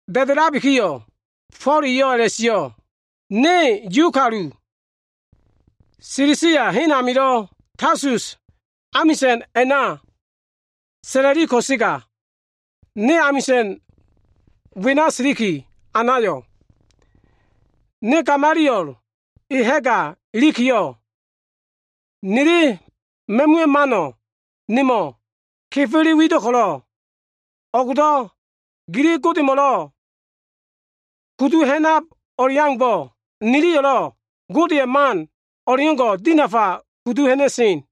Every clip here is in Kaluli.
Da꞉da꞉labiki Fo꞉l eyo꞉ a꞉la꞉sio꞉, “Ne Yu kalu, Silisia hen amio꞉ Tasus amisa꞉n a꞉na sa꞉la꞉li ko꞉sega, ne amisa꞉n wena siliki anayo꞉. Ne Gamaliel e ha꞉ga ilikiyo꞉, nili ma꞉muwa꞉ mano꞉ nemo꞉ kefele wido꞉ ko꞉lo꞉, o꞉gdo꞉ gili Godemo꞉lo꞉ kudu ha꞉nab o꞉leaumbo꞉, niyo꞉lo꞉ Godeya꞉ man o꞉leo꞉ngo꞉ka kudu ha꞉na꞉sen.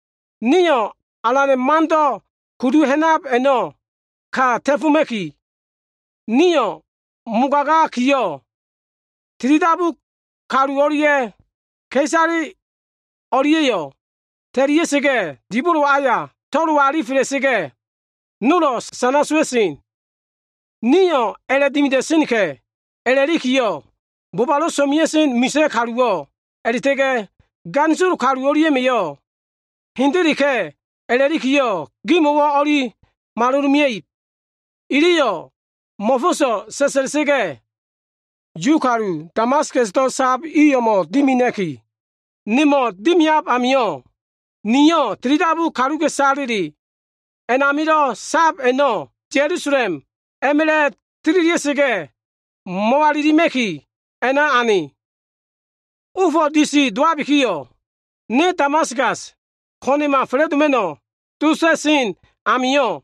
Niyo꞉ Alana꞉ Mando꞉ kudu ha꞉nab a꞉no꞉ ka ta꞉foma꞉ki, niyo꞉ mogagakiyo꞉, tilidabu kaluwo꞉lo꞉ ka꞉isaleyo꞉lo꞉ ta꞉lia꞉sa꞉ga꞉, dibolo aya to꞉lo alifela꞉sa꞉ga꞉, nolo꞉ sana sowa꞉sen. Niyo꞉ a꞉la꞉dimida꞉senka꞉ a꞉la꞉likiyo꞉, bobalo꞉ so꞉mea꞉sen misa꞉ kaluwo꞉ a꞉la꞉ta꞉ga꞉ ganisolo kalu o꞉lia꞉ma꞉yo꞉ hendeleka꞉ a꞉la꞉likiyo꞉ gimo꞉wo꞉ o꞉li maloloma꞉ib. Iliyo꞉ mo꞉fo꞉so꞉ sa꞉sa꞉la꞉sa꞉ga꞉, Yu kalu Damaskasdo꞉ sab i o꞉mo꞉ dimina꞉ki, nemo꞉ dimiab amio꞉, niyo꞉ tilidabu kaluka꞉isale a꞉namilo꞉ sab a꞉no꞉ Ya꞉lusalem a꞉ma꞉la꞉ tililia꞉sa꞉ga꞉ mo꞉walilima꞉ki, a꞉na ane. “Ofo꞉ disi dowabikiyo꞉, ne Damaskaso꞉ ko꞉na꞉ma fa꞉la꞉doma꞉no꞉ dota꞉sen amio꞉,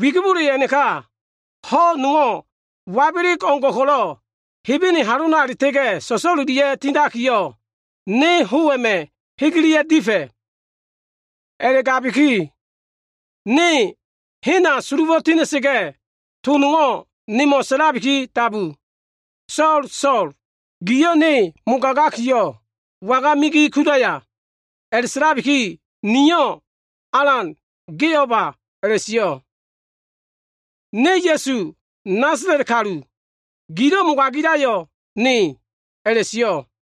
wigibole a꞉naka ho꞉ nowo꞉ wabeleg o꞉ngo꞉ ko꞉lo꞉ Hebene halona a꞉la꞉ta꞉ga꞉ so꞉so꞉lelia꞉ga꞉ tindakiyo꞉, ne ho꞉ a꞉ma꞉ hegelia꞉ga꞉ difa꞉. A꞉la꞉gabiki ne hena sulufo꞉ tina꞉sa꞉ga꞉, to nowo꞉ nemo꞉ sa꞉labiki dabu. ‘So꞉l, So꞉l, giyo꞉ Ne mogagakiyo꞉, waga migi kudaya?’ A꞉la꞉sa꞉labiki, niyo꞉, ‘Alan, ge o꞉ba?’ a꞉la꞉sio꞉. ‘Ne Ya꞉su, Nasala꞉t kalu. Gilo꞉ mogagila꞉yo꞉ Ne’ a꞉la꞉sio꞉.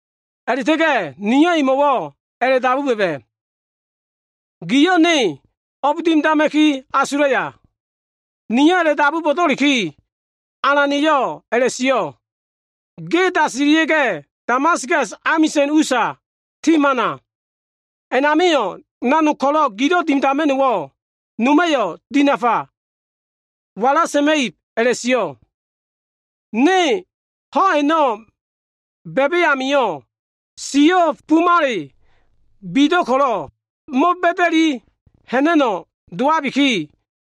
A꞉la꞉ta꞉ga꞉ niyo꞉ emo꞉wo꞉ a꞉la꞉dabu ba꞉ba꞉, ‘Giyo꞉ ne o꞉b dimidama꞉ki asulaya?’ Niyo꞉ a꞉la꞉dabubo꞉do꞉liki, Alana꞉yo꞉ a꞉la꞉sio꞉, ‘Ge dasilia꞉ga꞉, Damaskas amisa꞉n usa ti hamana. A꞉namio꞉, nanog ko꞉lo꞉ gilo꞉ dimidama꞉no꞉wo꞉ noma꞉yo꞉ dinafa wala sa꞉ma꞉ib’ a꞉la꞉sio꞉. Ne ho꞉ a꞉no꞉ ba꞉ba꞉ amio꞉ siyo꞉ bumale bido꞉ ko꞉lo꞉, mo꞉ba꞉da꞉li ha꞉na꞉no꞉ dowabiki,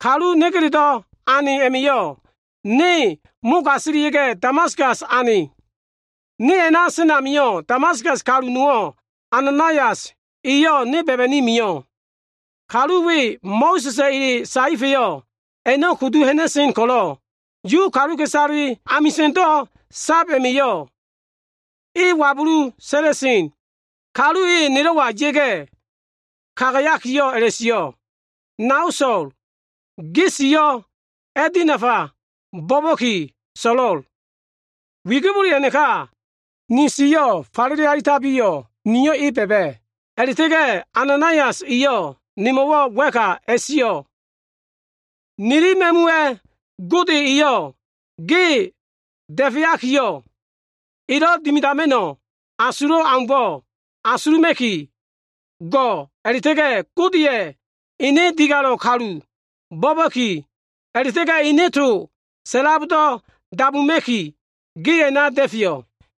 kalu negeledo꞉ ane a꞉ma꞉yo꞉ ne mogasilia꞉sa꞉ga꞉, Damaskas ane. “Ne a꞉na sen amio꞉, Damaskas kalu nowo꞉ Ananaias eyo꞉ ne ba꞉ba꞉ni mio꞉. Kalu we Mo꞉sa꞉sa꞉ ele saefa꞉ a꞉no꞉ kudu ha꞉na꞉len ko꞉lo꞉, Yu kaluka꞉isale amisa꞉ndo꞉ sab a꞉ma꞉yo꞉ e wabulu sa꞉la꞉sen. Kalu e nelo꞉wa ya꞉ga꞉ kagayakiyo꞉ a꞉la꞉sio꞉, ‘Nao So꞉l, ge siyo꞉ a꞉dinafa bo꞉ba꞉ki so꞉lo꞉l’ Wigibole a꞉naka, ni siyo꞉ falele alitabiyo꞉, niyo꞉ e ba꞉ba꞉. A꞉la꞉ta꞉ga꞉ Ananaias eyo꞉ nemo꞉wo꞉ wa꞉ka a꞉la꞉sio꞉, ‘Nili ma꞉muwa꞉ Gode eyo꞉ ge da꞉feakiyo꞉, elo꞉ dimidama꞉no꞉ asulo꞉ aumbo꞉ asuluma꞉ki go꞉ a꞉la꞉ta꞉ga꞉ Godeya꞉ ene Digalo꞉ Kalu bo꞉ba꞉ki, a꞉la꞉ta꞉ga꞉ ene to sa꞉labo꞉ dabuma꞉ki, ge a꞉na da꞉feyo꞉.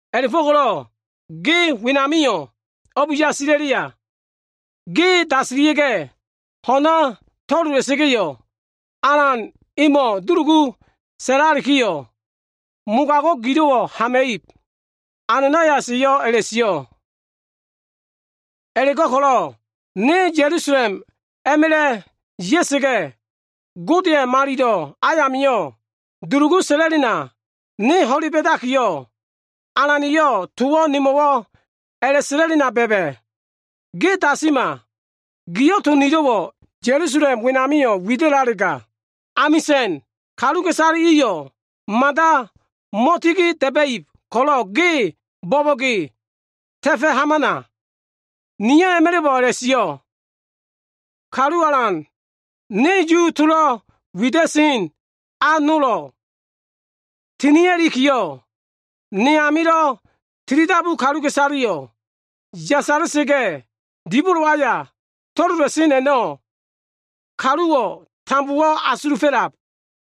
A꞉la꞉fo꞉ko꞉lo꞉ ge wenamio꞉ o꞉b yasila꞉leya? Ge dasilia꞉ga꞉, ho꞉na to꞉lola꞉sa꞉ga꞉yo꞉, Alan emo꞉ dulugu sa꞉lalikiyo꞉, mogago꞉ gilo꞉wo꞉ hama꞉ib.’ Ananaias eyo꞉ a꞉la꞉sio꞉. “A꞉la꞉go꞉ko꞉lo꞉ ne Ya꞉lusalem a꞉ma꞉la꞉ ya꞉sa꞉ga꞉, Godeya꞉ malilo꞉ ayamio꞉ dulugu sa꞉la꞉lena, ne ho꞉le ba꞉dakiyo꞉, Alana꞉yo꞉ towo꞉ nemo꞉ sa꞉la꞉lena ba꞉ba꞉. ‘Ge dasima! Giyo꞉ to nilo꞉wo꞉ Ya꞉lusalem wenamio꞉ wida꞉lalega, amisa꞉n kaluka꞉isale iyo꞉ mada mo꞉tigi da꞉ba꞉ib ko꞉lo꞉ ge bo꞉bo꞉ge ta꞉fo꞉ hamana.’ Niyo꞉ a꞉ma꞉la꞉bo꞉ a꞉la꞉sio꞉, ‘Kalu Alan, ne Yuwa꞉ tolo꞉ wida꞉sen a nola tina꞉likiyo꞉, ge amilo꞉ tilidabu kaluka꞉isaleyo꞉ yasala꞉sa꞉ga꞉ dibolo aya to꞉lola꞉sen a꞉no꞉, kaluwo꞉ tambowo꞉ asulufo꞉lab.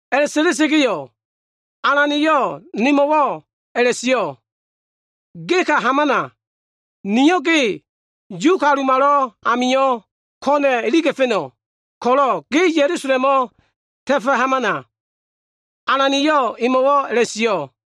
A꞉la꞉sa꞉la꞉sa꞉ga꞉yo꞉, Alana꞉yo꞉ nemo꞉wo꞉ a꞉la꞉sio꞉, ‘Ge ka hamana. Niyo꞉ ge Yu kalumalo꞉ amio꞉ ko꞉na꞉ iliga꞉fa꞉no꞉ ko꞉lo꞉, ge Ya꞉lusalemo꞉ ta꞉fo꞉ hamana.’ Alana꞉yo꞉ nemo꞉wo꞉ a꞉la꞉sio꞉.”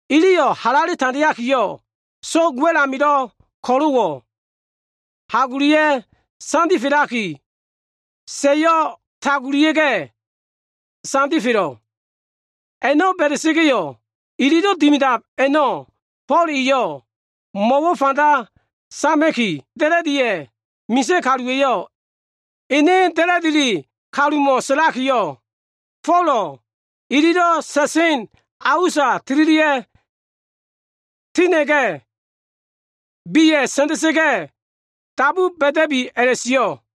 Iliyo꞉ halale tandeakiyo꞉, so꞉g wa꞉l amilo꞉ ko꞉lo꞉wo꞉ hagolia꞉ sandifelaki, sa꞉yo꞉ tagulia꞉ga꞉ sandifelo꞉. A꞉no꞉ ba꞉da꞉sa꞉ga꞉yo꞉ ililo꞉ dimidab a꞉no꞉ Fo꞉l eyo꞉ mo꞉wo꞉ fanda sama꞉ki, da꞉la꞉diya꞉ misa꞉ kaluwa꞉yo꞉ ene da꞉la꞉dile kalumo꞉ sa꞉lakiyo꞉, Folo꞉ ilo꞉ sa꞉sen a usa tililia꞉ tina꞉ga꞉, meya꞉ sa꞉nda꞉sa꞉ga꞉, dabu ba꞉da꞉bi a꞉la꞉sio꞉.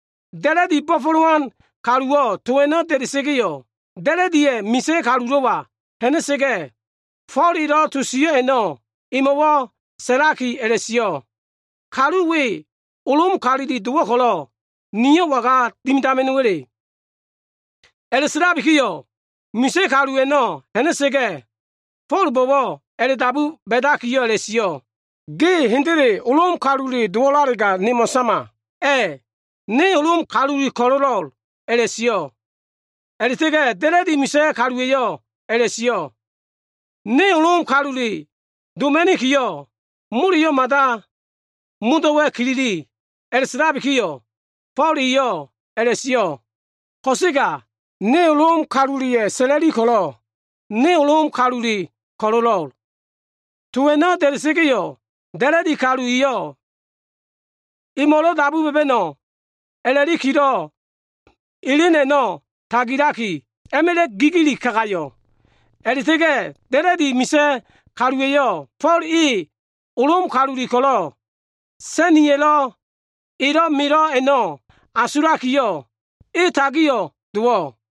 Da꞉la꞉dilo꞉ bo꞉fo꞉lowan kaluwo꞉ to a꞉no꞉ da꞉da꞉sa꞉ga꞉yo꞉, da꞉la꞉diya꞉ misa꞉ kalulo꞉wa ha꞉na꞉sa꞉ga꞉, Fo꞉l elo꞉ to sio꞉ a꞉no꞉ emo꞉wo꞉ sa꞉laki a꞉la꞉sio꞉, “Kalu we Lom kalule dowo꞉ ko꞉lo꞉ nio꞉ waga dimidama꞉no꞉wa꞉le?” A꞉la꞉sa꞉labikiyo꞉, misa꞉ kalu a꞉no꞉ ha꞉na꞉sa꞉ga꞉, Fo꞉lbo꞉wo꞉ a꞉la꞉dabu ba꞉dakiyo꞉ a꞉la꞉sio꞉, “Ge hendele Lom kalule dowo꞉lalega, nemo꞉ sama.” “A꞉, ne Lom kalule ko꞉lo꞉lo꞉l” a꞉la꞉sio꞉. A꞉la꞉ta꞉ga꞉ da꞉la꞉di misa꞉ kaluwa꞉yo꞉ a꞉la꞉sio꞉, “Ne Lom kalule doma꞉nikiyo꞉, moleyo꞉ mada modo꞉wa꞉ kilili.” A꞉la꞉sa꞉labikiyo꞉, Fo꞉l eyo꞉ a꞉la꞉sio꞉, “Ko꞉sega ne Lom kaluleya꞉ sa꞉la꞉li ko꞉lo꞉ ne Lom kalule ko꞉lo꞉lo꞉l.” To a꞉no꞉ da꞉da꞉sa꞉ga꞉yo꞉, da꞉la꞉di kalu iyo꞉ emo꞉lo꞉ dabu ba꞉ba꞉no꞉ a꞉la꞉likilo꞉ elen a꞉no꞉ tagilaki, a꞉ma꞉la꞉ gigili kagayo꞉. A꞉la꞉ta꞉ga꞉ da꞉la꞉di misa꞉ kaluwa꞉yo꞉, Fo꞉l e Lom kalule ko꞉lo꞉ sa꞉niya꞉lo꞉ elo꞉ melo꞉ a꞉no꞉ asulakiyo꞉, e tagio꞉ dowo꞉.